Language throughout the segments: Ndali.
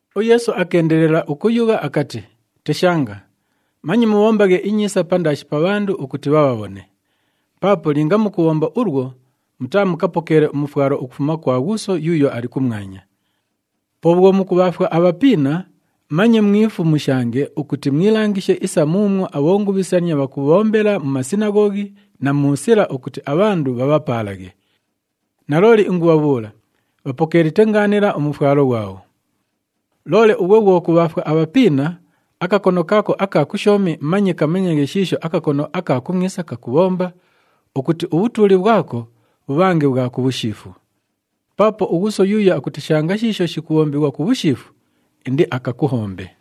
UYeesu akeendelela ukuyugha akati, “Teshanga! Manye mubhombaghe inyiisa pandaashi pa bhandu ukuti bhabhabhone. Paapo linga mukubhomba ulwo, mutaamukapokeele umufwalo ukufuma kwa Ghuuso yuuyo ali kumwanya. Po bhwo mukubhaafwa abhapiina, manye mwifumushange ukuti mwilangishe isa muumwo abhongubhisania bhakubhombela mu masinaghoghi na mu sila ukuti abhandu bhabhapaalaghe. Nalooli ingubhabhuula, bhapokeelite ngaanila umufwalo ghwabho. Loole ughwe bhwo kubhaafwa abhapiina, akakono kaako aka kushoomi manye kamanyaghe shiisho akakono aka kumwisa kakubhomba, ukuti ubhutuuli bhwako bhubhange bhwa ku bhushiifu. Paapo uGhuuso yuuyo akuteshanga shiisho shikubhombighwa ku bhushiifu, indiakakuhombe.”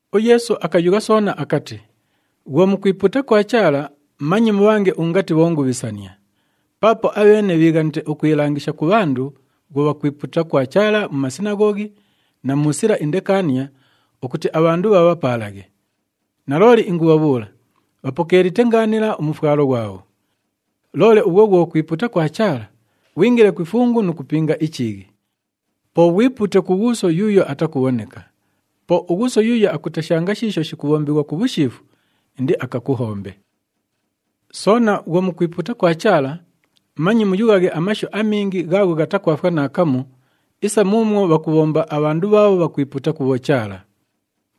UYeesu akayugha soona akati, “Bhwo mukwipuuta kwa Chaala, manye mubhange ungati bhongubhisania. Paapo abheene bhiighanite ukwilangisha ku bhandu bhwo bhakwipuuta kwa Chaala mu masinaghoghi na mu sila indekaania ukuti abhandu bhabhapaalaghe. Nalooli ingubhabhuula, bhapokeelite ngaanila umufwalo ghwabho. Loole ughwe bhwo kwipuuta kwa Chaala, ghwingile ku ifungu nu kupinga ichiighi. Po ghwipuute ku Ghuuso yuuyo atakubhoneka. Po uGhuuso yuuyo akuteshanga shiisho shikubhombighwa ku bhushiifu, indiakakuhombe. “Soona bhwo mukwipuuta kwa Chaala, manye muyughaghe amashu amingi ghaagho ghatakwafwa naakamu isa muumwo bhakubhomba abhandu bhaabho bhakwipuuta ku bhochaala.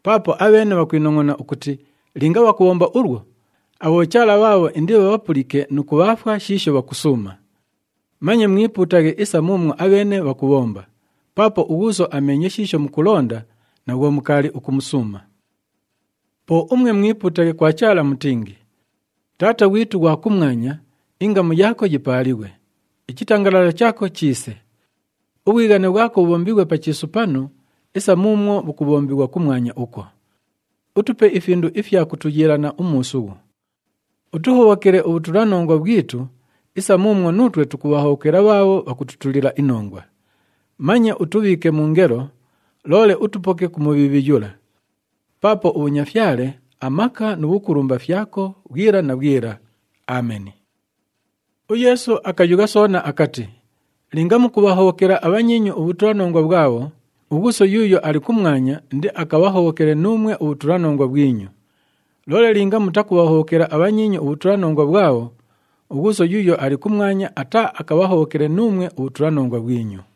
Paapo abheene bhakwinongʼona ukuti linga bhakubhomba ulwo, abhochaala bhaabho indibhabhapulike nu kubhaafwa shiisho bhakusuuma. Manye mwipuutaghe isa muumwo abheene bhakubhomba, paapo uGhuuso ameenye shiisho mukulonda na bhwo mukaali ukumusuuma. Po umwe mwipuutaghe kwa Chaala mutingi, ‘Taata ghwitu ughwa kumwanya, ingamu yaako yipaalighwe. Ichitangalala chaako chiise. Ubhwighane bhwako bhubhombighwe pa chiisu panu, isa muumwo bhukubhombighwa kumwanya ukwo. Utupe ifindu ifya kutuyiilana umuusughu. Utuhobhokele ubhutulanongwa bhwitu, isa muumwo nuutwe tukubhahobhokela bhaabho bhakututulila inongwa. Manye utubhiike mu ngelo, loole utupoke ku Mubhiibhi yula. [Paapo ubhunyafyale, amaka nu bhukulumba fyako bhwila na bhwila. Ameni.]’” UYeesu akayugha soona akati, “Linga mukubhahobhokela abhanyiinyu ubhutulanongwa bhwabho, uGhuuso yuuyo ali kumwanya indiakabhahobhokele nuumwe ubhutulanongwa bhwinyu. Loole linga mutakubhahobhokela abhanyiinyu ubhutulanongwa bhwabho, uGhuuso yuuyo ali kumwanya ataaakabhahobhokele nuumwe ubhutulanongwa bhwinyu.”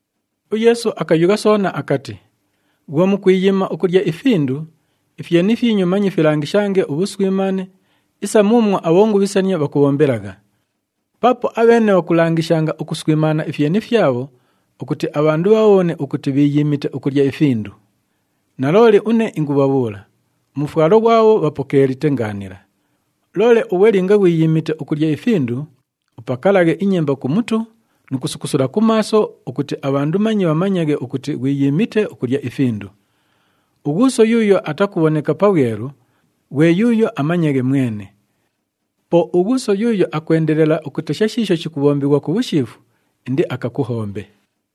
UYeesu akayugha soona akati, “Bhwo mukwiyiima ukulya ifindu, ifyeni fyinyu manye filangishange ubhuswimaane isa muumwo abhongubhisania bhakubhombelagha. Paapo abheene bhakulangishanga ukuswimaana ifyeni fyabho ukuti abhandu bhabhabhone ukuti bhiiyiimite ukulya ifindu. Nalooli une ingubhabhuula, umufwalo ghwabho bhapokeelite ngaanila. Loole ughwe linga ghwiyiimite ukulya ifindu, upakalaghe inyemba ku mutu nu kusukusula ku maaso, ukuti abhandu manye bhamanyaghe ukuti ghwiyiimite ukulya ifindu. UGhuuso yuuyo atakubhoneka pabhwelu, ghwe yuuyo amanyaghe mwene. Po uGhuuso yuuyo akwendelela ukutesha shiisho shikubhombighwa ku bhushiifu, indiakakuhombe.”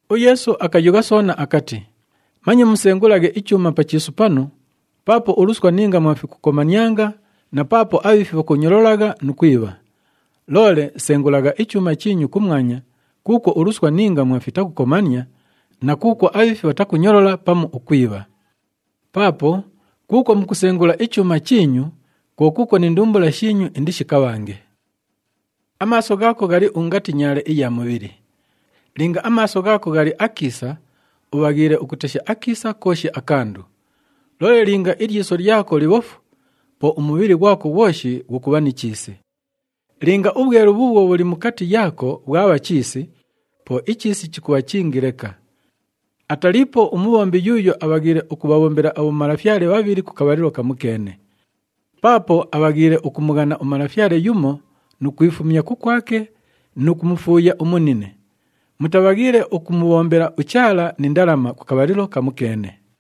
UYeesu akayugha soona akati, “Manye musengulaghe ichuuma pa chiisu panu, paapo uluswa ni ngamwa fikukomanianga na paapo abhiifi bhakunyololagha nu kwibha. Loole sengulagha ichuuma chiinyu kumwanya kuukwo uluswa ni ngamwa fitakukomania na kuukwo abhiifi bhatakunyolola pamu ukwibha. Paapo kuukwo mukusengula ichuuma chiinyu, kwo kuukwo ni ndumbula shiinyu indishikabhange. “Amaaso ghaako ghali ungati nyaale iya mubhili. Linga amaaso ghaako ghali akiisa, ubhaghiile ukutesha akiisa kooshi akandu. Loole linga ilyiso lyako libhofu, po umubhili ghwako ghwoshi ghukubha ni chiisi. Linga ubhwelu bhuubhwo bhuli mukati yaako bhwabha chiisi, po ichiisi chikubha chingi leka! “Ataliipo umubhombi yuuyo abhaghiile ukubhabhombela abhomalafyale bhabhili ku kabhalilo kamukeene. Paapo abhaghiile ukumughana umalafyale yumo nu kwifumya kukwake nu kumufuuya umunine. Mutabhaghiile ukumubhombela uChaala ni ndalama ku kabhalilo kamukeene!”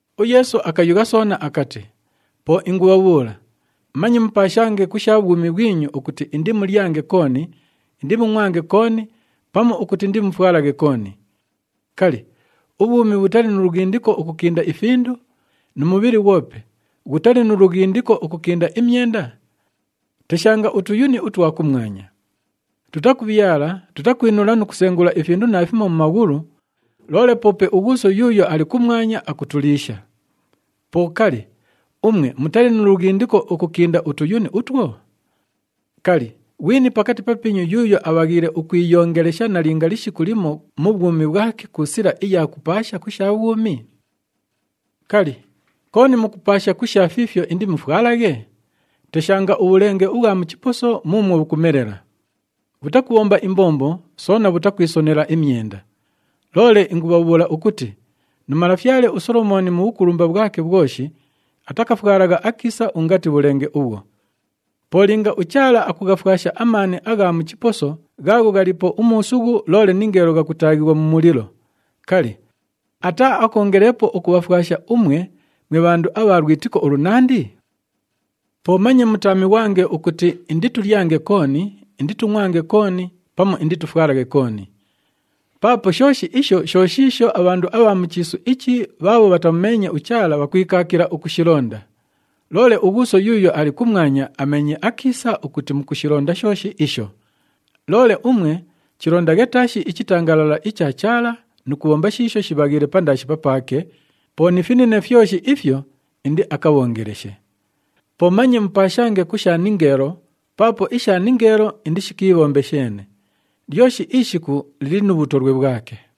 UYeesu akayugha soona akati, “Po ingubhabhuula, manye mupaashange ku sha bhwumi bhwinyu ukuti indimulyange kooni, indimungʼwange kooni pamu ukuti indimufwalaghe kooni. Kali, ubhwumi bhutali nu lughindiko ukukinda ifindu, nu mubhili ghwope ghutali nu lughindiko ukukinda imyenda? Teshanga utuyuni utwa kumwanya. Tutakubhyala, tutakwinula nu kusengula ifindu naafimo mu maghulu, loole poope uGhuuso yuuyo ali kumwanya, akutuliisha. Po kali, umwe mutali nu lughindiko ukukinda utuyuni utwo? Kali, ghwini pakati papiinyu yuuyo abhaghiile ukwiyongelesha nalinga lishiku limo mu bhwumi bhwake ku sila iya kupaasha ku sha bhwumi? “Kali, kooni mukupaasha ku sha fiifyo indimufwalaghe? Teshanga ubhulenge ubhwa mu chiposo muumwo bhukumelela! Bhutakubhomba imbombo, soona bhutakwisonela imyenda. Loole ingubhabhuula ukuti nu malafyale uSolomooni mu bhukulumba bhwake bhwoshi atakafwalagha akiisa ungati bhulenge ubhwo! Po linga uChaala akughafwasha amaani agha mu chiposo ghaagho ghaliipo umuusughu loole ningeelo ghakutaaghighwa mu mulilo, kali, ataaakoongeleepo ukubhafwasha umwe, mwe bhandu abha lwitiko ulunandi? “Po manye mutaamighwange ukuti, ‘Inditulyange kooni, inditungʼwange kooni pamu inditufwalaghe kooni.’ Paapo shooshi isho sho shiisho abhandu abha mu chiisu ichi bhaabho bhatamumeenye uChaala bhakwikaakila ukushilonda, loole uGhuuso yuuyo ali kumwanya ameenye akiisa ukuti mukushilonda shooshi isho. Loole umwe chilondaghe taashi ichitangalala icha Chaala nu kubhomba shiisho shibhaghiile pandaashi papaake, po ni finine fyoshi ifyo indiakabhoongeleshe. “Po manye mupaashange ku sha ningeelo paapo isha ningeelo indishikiibhombe sheene. Lyoshi ishiku lili nu bhutolwe bhwake.”